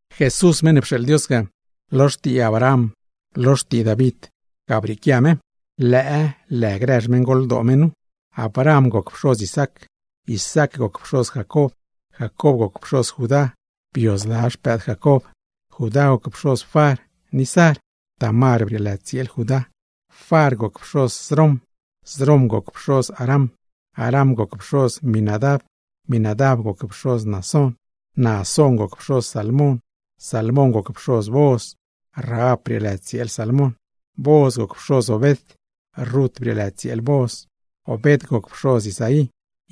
Jesús meṉ ne pxeeḻ Dios ga, lo xtii Abraham, lo xtii David, ga brieequia me. Lëë grë xmeṉgoldoo me nu: Abraham goc pxoz Isaac, Isaac goc pxoz Jacob, Jacob goc pxoz Judá (bio zla xpëëd Jacob), Judá goc pxoz Far ni Zar (Tamar brieelë tsieel Judá), Far goc pxoz Srom, Srom goc pxoz Aram. Aram goc pxoz Minadab, Minadab goc pxoz Naasón, Naasón goc pxoz Salmon. Salmóngoc pxoz Booz (Rahab brieelë tsieel Salmon), Booz goc pxoz Obed (Rut brieelë tsieel Booz), Obed goc pxoz Isaí.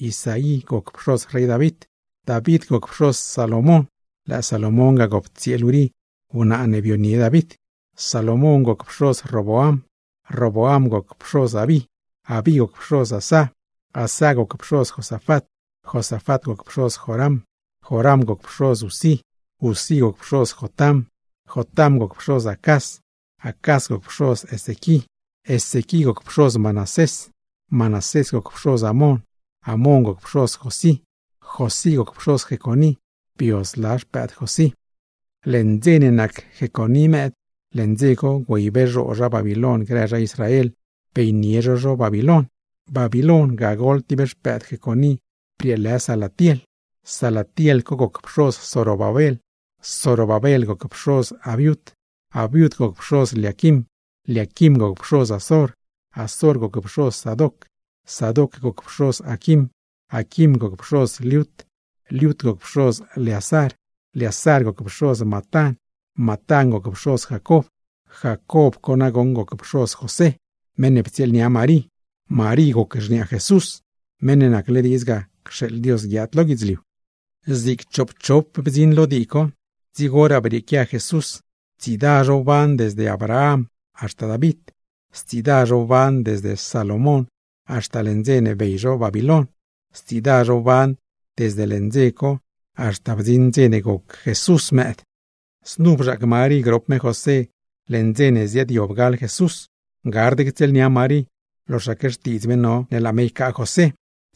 Isaí goc pxoz rey David, David goc pxoz Salomón (lëë Salomón ga gop tsieel Urí wnaa ne bionie David). Salomón goc pxoz Roboam, Roboam goc pxoz Abí, Abí goc pxoz Asá, Asá goc pxoz Josafat, Josafat goc pxoz Joram, Joram goc pxoz Uzí. Uzí goc pxoz Jotam, Jotam goc pxoz Acaz, Acaz goc pxoz Ezequí. Ezequí goc pxoz Manasés, Manasés goc pxoz Amón, Amón goc pxoz Josí, Josí goc pxoz Jeconí (bio zla xpëëd Josí). Leṉ dze ne nac Jeconí mëëd, leṉ dze co güeybee zhoo zha Babiloin grë zha Israel, beynie zho zho Babiloin. Babiloin, ga gol tib xpëëd Jeconí brieelë Salatiel, Salatiel goc pxoz Zorobabel. Zorobabel goc pxoz Abiud, Abiud goc pxoz Liaquim, Liaquim goc pxoz Azor. Azor goc pxoz Sadoc, Sadoc goc pxoz Aquim, Aquim goc pxoz Liud. Liud goc pxoz Leazar, Leazar goc pxoz Matán, Matán goc pxoz Jacob. Jacob co nagoṉ goc pxoz José, meṉ ne ptsieelnia Marí. Marí goc xniaa Jesús, Meṉ ne nacle diidz ga cxeeḻ Dios guiaad lo guidzliu. Zig choopchop bdziṉ lo dii co, dzigoraa brieequia Jesús. Tsiida zho wban desde Abraham haxta David; stsiida zho wban desde Salomón haxta leṉ dze ne bey zho Babiloin; stsiida zho wban desde leṉ dze co haxta bdziṉ dze ne goc me mëëd. Znu bzhaac Marí grop José leṉ dze ne ziaadyob gal Jesús. Gard ctsieelnia Marí loxaque xtiidz me no ne laa me ycaa José,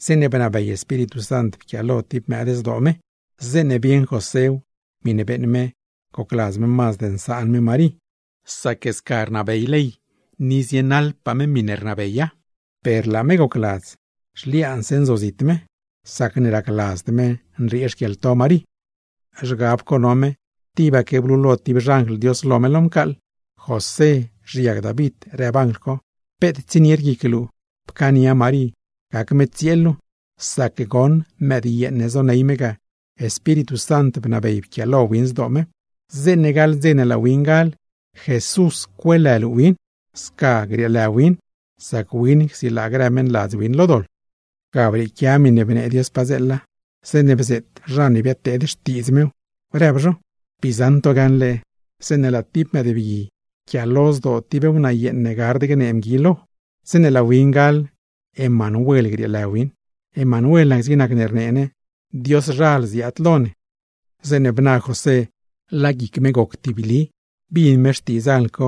zeeṉe bnabey Espíritu Sant pquialo tib mëëd zdoo me. Zeeṉe bieṉ Joséw, miṉe beeṉ me gocladz me mazd nsaan me Marí; sac sca rnabey ley ni zienaḻpaa me miṉe rnabey ley; per laa me gocladz zhliaanse nzozit me, sacne racladzd me nriee xquieḻto Marí. Zhgab co no me, tibaque blulo tib xanjl Dios lo me lo mcaaḻ. ―José (xiag David) ―rëb anjl co―, peet tsienied guic luu, pcaania Marí gac me tsieel luu; sac goṉ mëdyeeṉ ne zoney me ga, Espíritu Sant bnabey pquialo win zdoo me. Zeeṉe gaḻ dze ne laa win gal, JESUS cueelë luu win, sca grieelë win sac win csilaa grë meṉladz win lo doḻ. Ga brieequia miṉe bnee Dios padzeela, zeeṉe bzeet zha ne biadnee xtiidz mew, rëb zho: Bii zaṉ to gaṉle zeeṉe laa tib mëëdbgui yquiaalo zdoo tib wnaayeeṉ ne gard gnee mgui lo. Zeeṉe laa win gal, Emanuel grieelë win. (Emanuel nac zig nacne rnee ne: Dioszhal ziaad lo ne.) Zeeṉe bna José laa guic me goc tibli; bin me xtiidz anjl co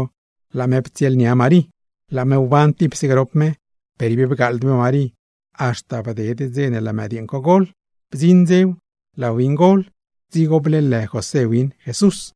laa me ptsieelnia Marí. Laa me wban tipse grop me per ib bgaaḻd me Marí, haxta bded dze ne laa mëdyeeṉ co gol. Bdziṉ dzew, laa win gol, dzigo bleelë José win JESUS.